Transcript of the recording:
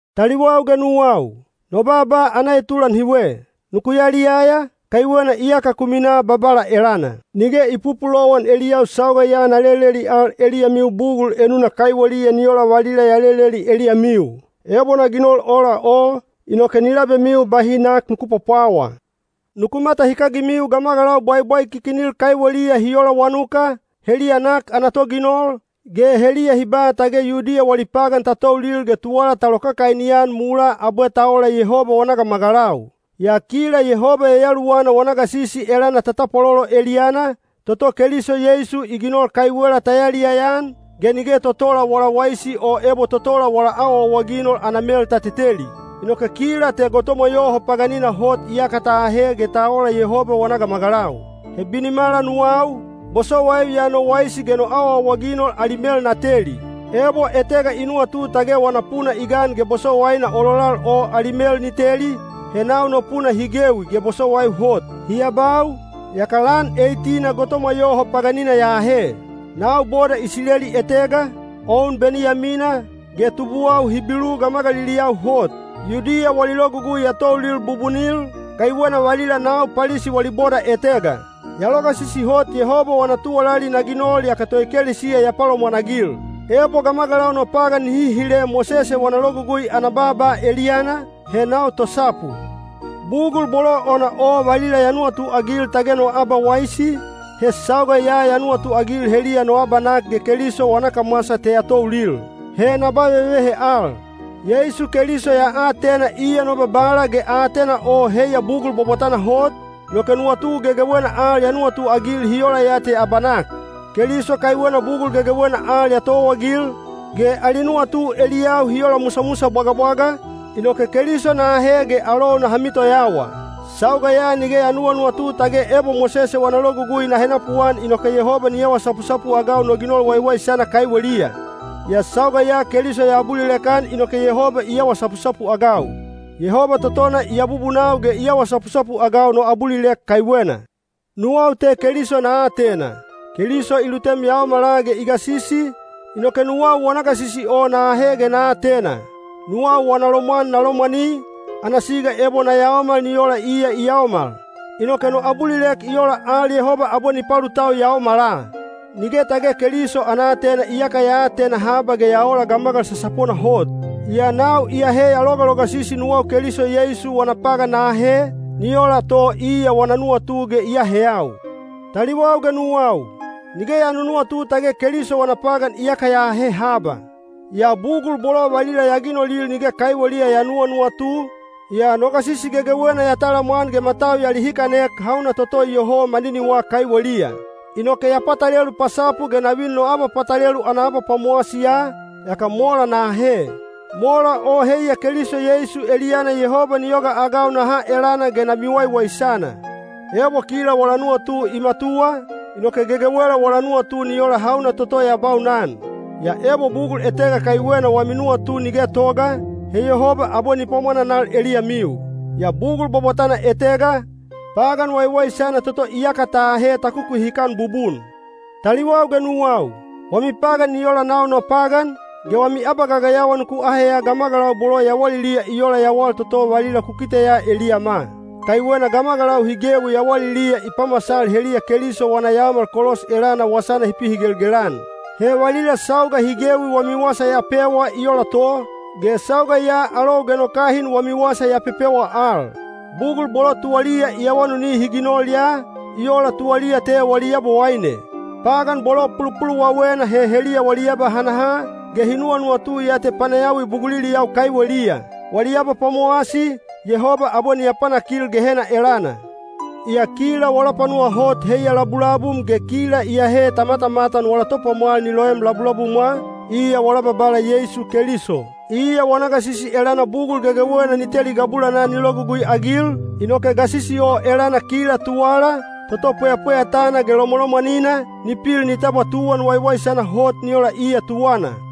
Taliwau ge nuwau, no baaba ana etulan hiwe: nuku yaliyaya, kaiwena iyaka ku minaa Babala elana. Nige i pupulowan eliyau sauga ya na leleli al eliyamiu bugul enuna kaiweliya ni ola valila ya leleli eliyamiu. Ebo na ginol ola o, inoke ni labemiu bahi nak nuku pwapwawa. Nuku matahikagimiu gamagalau bwaibwaikikinil kaiweliya hi ola wanuka, heliya nak ana toginol, ge heliya hi ba tage Yudiya wali pagan ta toulil ge tuwala ta lokakaini-an mulaa abwe ta ola Yehoba wana gamagalau. Yaa kila Yehoba Yayaluwana wana gasisi elana ta tapwalolo eliyana, toto Keliso Yeisu i ginol kaiwela ta yaliyaya-an, ge nige totola wala waisi o ebo totola wala awaawaginol ana mel ta teteli. Inoke kila te gotomwa yoho paganina hot iyaka ta ahe ge ta ola Yehoba wana gamagalau. He binimala nuwau, bosowaiu ya no waisi ge no awaawaginol ali mel na teli. Ebo etega i nuwatu tage wana puna i gan ge bosowaina ololal o ali mel ni teli, he nau no puna hi gewi ge bosowaiu hot. Hi abau, yaka lan eit-ina gotomwa yoho paganina ya ahe. Nau boda Isileli etega, o un Beniyamina, ge tubuwau Hibilu gamagaliliyau hot. Yudiya wali logugui ya toulil bubunil, kaiwena valila nau Palisi wali boda etega. Ya logasisi hot Yehoba wana tuwalali na ginol yaka toekelesiya ya palomwanagil. Ebo gamagalau no pagan nihi hile Mosese wana Logugui ana baaba eliyana, he nau tosapu. Bugul bolo ona o valila ya nuwatuagil tage no abawaisi, he sauga ya ya nuwatuagil heliya no abanak ge Keliso wana kamwasa te ya toulil. He na ba vevehe al. Yeisu Keliso ya atena iya no Babala ge aatena o heiya bugul bwabwatana hot, inoke nuwatu gegewena al ya nuwatuagil hi ola ya te abanak. Keliso kaiwena bugul gegewena al ya towaagil, ge ali nuwatu eliyau hi ola musamusa bwagabwaga, inoke Keliso na ahe ge alou naha mitoyawa. Sauga ya nige ya nuwanuwatu tage ebo Mosese wana logugui na henapuan inoke Yehoba ni awa sapusapu-agau no ginol waiwaisana kaiweliya. Yaa sauga ya Keliso ya abulilek-an inoke Yehoba i awa sapusapu-agau. Yehoba totona i abubunau ge i awa sapusapu-agau no abulilek kaiwena. Nuwau te Keliso na atena. Keliso i lutem yaomala ge i gasisi, inoke nuwau wana gasisi o na ahe ge na atena. Nuwau wana lomwan na lomwani, ana siga ebo na yaomal ni ola iya i yaomal. Inoke no abulilek i ola al Yehoba abwe ni palutau yaomala. Nige tage Keliso ana aatena iyaka ya atena haba ge ya ola gamagal sasapona hot. Yaa nau iyahe ya logalogasisi nuwau Keliso Yeisu wana pagan na ahe, ni ola to iya wana nuwatu ge i aheyau. Taliwau ge nuwau, nige ya nunuwatu tage Keliso wana pagan iyaka ya ahe haba. Yaa bugul bolo valila ya ginolil nige kaiweliya ya nuwanuwatu, yaa no gasisi gegewena ya talamwan ge matau ya lihikanek hauna toto iyoho maniniwa kaiweliya. Inoke ya patalelu pasapu ge na vin no abapatalelu ana abapwamowasiya, yaka mola na ahe. Mola o heiya Keliso Yeisu eliyana Yehoba ni yogaagau na ha elana ge na miwaiwaisana. Ebo kila wala nuwatu i matuwa, inoke gegewela wala nuwatu ni ola hauna toto ya baunan. Yaa ebo bugul etega kaiwena wami nuwatu ni getoga, he Yehoba abwe ni pwamwananal eliyamiu. Yaa bugul bwabwatana etega, pagan waiwaisana toto iyaka ta ahe ta kukuhikan bubun. Taliwau ge nuwau, wami pagan ni ola nau no pagan, ge wami abagagayawa nuku aheya gamagalau bolo yawaliliya i ola yawal toto valila ku kiteya eliyama. Kaiwena gamagalau hi gewi yawaliliya i pamasal heliya Keliso wana yaomal kolos elana wasana hi pihigelgel-an. He valila sauga hi gewi wami wasa ya pewa i ola to, ge sauga ya alou ge no kahin wami wasa ya pepewa al. Bugul bolo tuwaliya i awanuni hi ginol ya, i ola tuwaliya te wali yabowaine. Pagan bolo pulupuluwawena he heliya wali abahanaha, ge hi nuwanuwatu ya te panayawi buguliliyau kaiweliya. Wali abapwamowasi, Yehoba abwe ni apanakil Gehena elana. Yaa kila wala panuwa hot heiya labulabum ge kila iyahe ta matamatan wala Topwamwal ni loem labulabumwa, iya wala Babala Yeisu Keliso. Iya wana gasisi elana bugul gegewena ni teli gabulanaa ni logugui-agil, inoke gasisi o elana kila tuwala, toto pweyapweyatana ge lomwalomwanina, ni pil ni tabwa tuwan waiwaisana hot ni ola iya tuwana.